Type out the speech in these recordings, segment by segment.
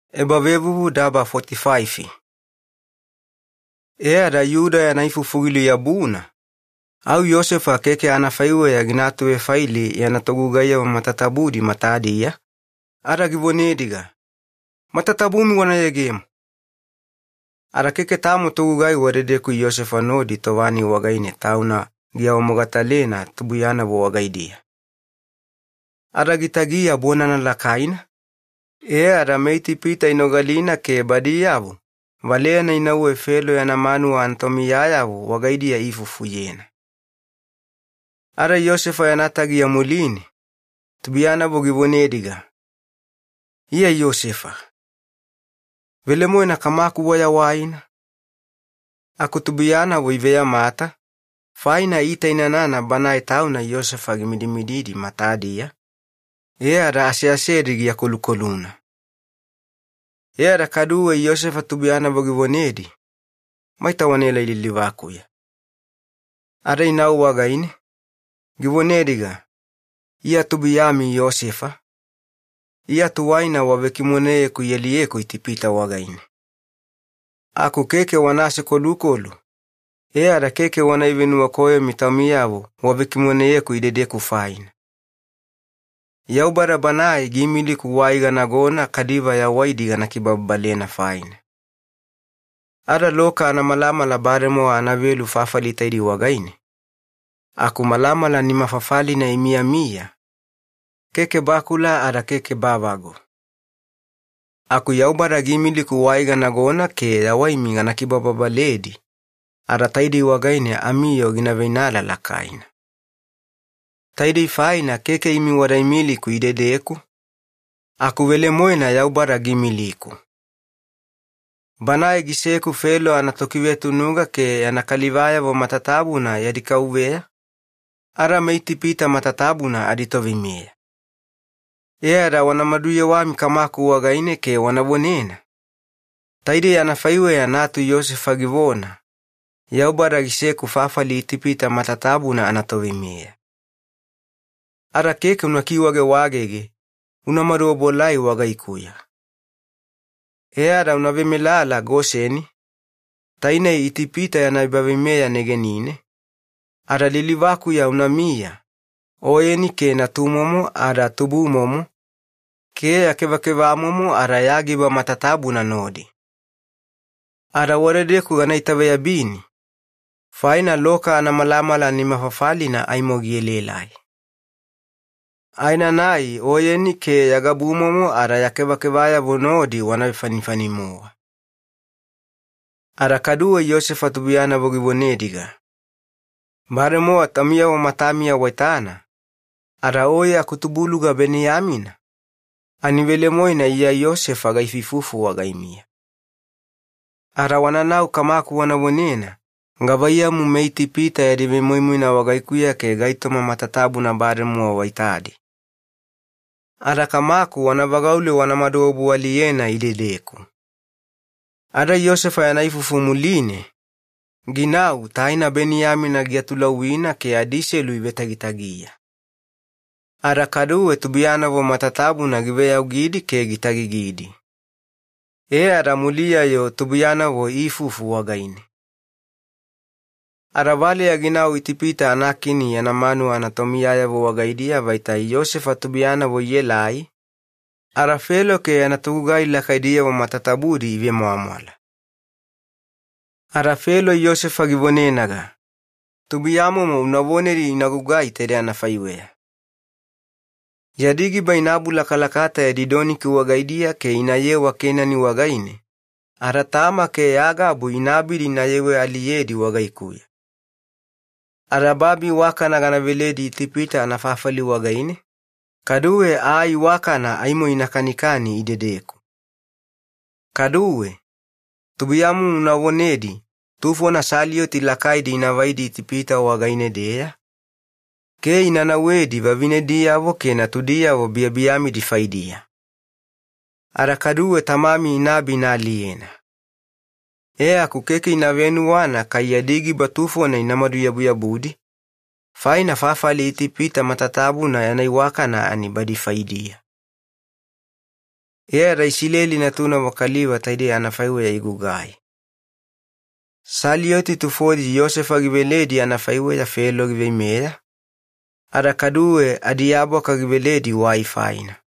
Yosefa tauna giawamogatalena. E ada Yuda yana ifufu giluyabuna, au Yosefa keke anafaiweya gina atuvefaili yana togugaiyavo matatabudi matadiya, ada givonediga, “Matatabumi wana yegemo!” Ada keke tamo togugai wadedeku Yosefa nodi tova-nai wagaine tauna giawamogatalena tubuiyanavo wagaidiya. Ada gitagiya bonana lakaina, e ada meItipita inogalina ke badiyavo valeyana inauwe Felo yana manuwa anatomiyayavo wagaidiya iifufuyena. Ada Yosefa yana tagiya muline tubuiyanavo givonediga, “Iya Yosefa. Velemoena, kamaku wayawaina?” Aku tubuiyanavo iveyamata, faina iitainanana banae tauna Yosefa gimidimididi matadiya, ada aseasedi giakolukoluna. E ada kaduwe Yosefa tubuiyanavo givonedi, “Maita wanaelai lilivakuya.” Ada inau wagaine, givonediga, “Iya amitubuluga Yosefa, iya tuwaina wavekimoneyeku ialiyeku Itipita wagaine. Aku keke wana asekolukolu, e ada keke wana ivenuwakoyomi taumiyavo wavekimoneyeku idedeku faina. Yaubada Banae giimiliku wai ganagona kaliva yawaidi gana kibababalena faina. Ada loka anamalamala bademowa anavelu fafali taidei wagaine aku malamala nimafafalina imiyamiya, keke bakula ada keke bavagu. Aku Yaubada giimiliku wai ganagona ke yawaimi gana kibababaledi ada taidei wagaine amiyoo gina veinala lakaina. Taidei faina keke imi wada imiliku idedeku, aku velemoena Yaubada giimiliku. Banae giseku Felo anatokivetunuga, ke yana kalivayavo matatabuna yadi kauveya, ada meItipita matatabuna aditoveimeya. E ada wana maduyewami kamaku wagaine ke wana vonena, ‘Taidei anafaiweya natu Yosefa givona, Yaubada giseku fafali Itipita matatabuna anatoveimeya. Ada keke una vedidiu, una maduobuelai wagaikuya. E ada una vemelala Goseni, tainei Itipita yana ebaveimeya negenine, ada lilivakuya unamiya, oyeni ke natumomo ada tubumomo, ke ya kevakevamomo ada ya giba matatabuna nodi. Ada wadedeku gana itaveyabini, faina loka anamalamala nimafafalina aimo gielaelai. Aenanai oyeni ke ya gabumomo ada ya kevakevayavo nodi wana vefanifani-mowa.’” Ada kaduwe Yosefa tubuiyanavo givonediga, “Bademowa taumiyavo matamiya waitana, ada oye akutubuluga Beniyamina, ani velemoena iya Yosefa gaifuifufu wagaimiya. Ada wananau kamaku wana vonena gavaiyamu meItipita yadi vemoimoina wagaikuya ke gaitoma matatabuna bademowa waitadi. Ada kamaku wana vagaule wanamadu obualiyena idedeku.” Ada Yosefa yana ifufu muline, ginau taina Beniyamina giatulauwina ke adiselu ivetagitagiya. Ada kaduwe tubuiyanavo matatabuna giveyaugidi ke gitagigidi. E ada muliya-yo tubuiyanavo iifufu wagaine. Ada valeya ginau Itipita anakini yana manuwa anatomiyayavo wagaidiya vaita Yosefa anatubulugayavo ielai, ada Felo ke yana togugai lakaidiyavo matatabudi ivemwamwala. Ada Felo Yosefa givonenaga, “Atubuluga-momo una vonedi taidei ina gugaiyena: Yadi giba ina abulakalakata yadi doniki wagaidiya ke inayewa Kenani wagaine, ada tama ke ya gabu ina abidi inayewe-aliyedi wagaikuya. Ada babi iwakana gana veledi Itipita anafafali wagaine, kaduwe aa iwakana aimo ina kanikani idedeku. Kaduwe, tubuiyamomo una vonedi tufona saliyoti lakaidi inavaidi Itipita wagaine-deya ke ina nauwedi vavinediyavo ke natudiyavo biyabiyamidi faidiya. Ada kaduwe tamami inaabi inaaliyena. E aku keke ina venuwana kai yadi giba tufona inamadu-yabuyabudi, faina fafali Itipita matatabuna yana iwakana ani badi faidiya.” E ada Isileli natunavo kaliva taidei anafaiweya igugai: tufona saliyoti Yosefa giveledi anafaiweya Felo giveimeya, ada kaduwe adiabwaka giveledi wai faina.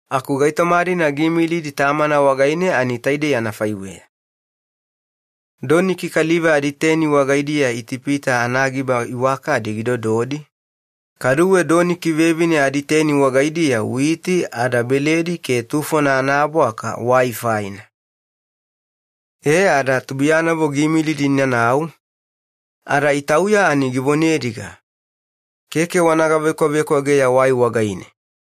Aku taidei gaitoma-dina ani giimilidi tamana wagaine: doniki kaliva aditeni wagaidiya Itipita anagiba iwakadi gidododi, kaduwe doniki vevine aditeni wagaidiya witi ada beledi ke tufona anaabwaka wai faina. E ada tubuiyanavo giimilidi inanau, ada itauya ani givonediga, “Keke wana gavekwavekwageya waiya!”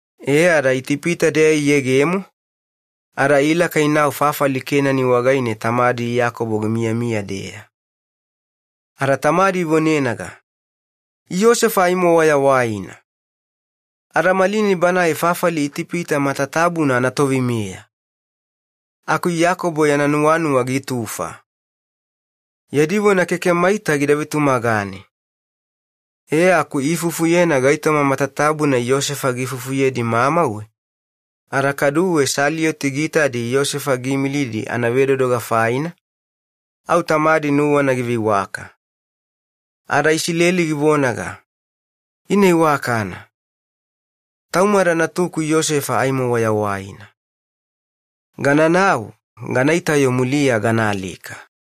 E ada Itipita-deya iyegemo ada ilaka inau fafali Kenani wagaine tamadi Iyakobo gimiyamiya-deya. Ada tamadi ivonenaga, “Yosefa aimo wayawaina! Ada malinai banae fafali Itipita matatabuna anatoveimeya!” Aku Iyakobo yana nuwanuwa gitufa. Yadi vona keke gida vetumagane. E aku iifufuyena gaitoma matatabuna Yosefa giifufuyedi mamauwe ada kaduwe saliyoti giitadi Yosefa giimilidi anavedodoga faina, au tamadi nuwana giveiwaka. Ada Isileli givonaga, “Ina iwakana. Taumada natuku Yosefa aimo wayawaina. Gananau ganaita-yo muliya ganaalika.”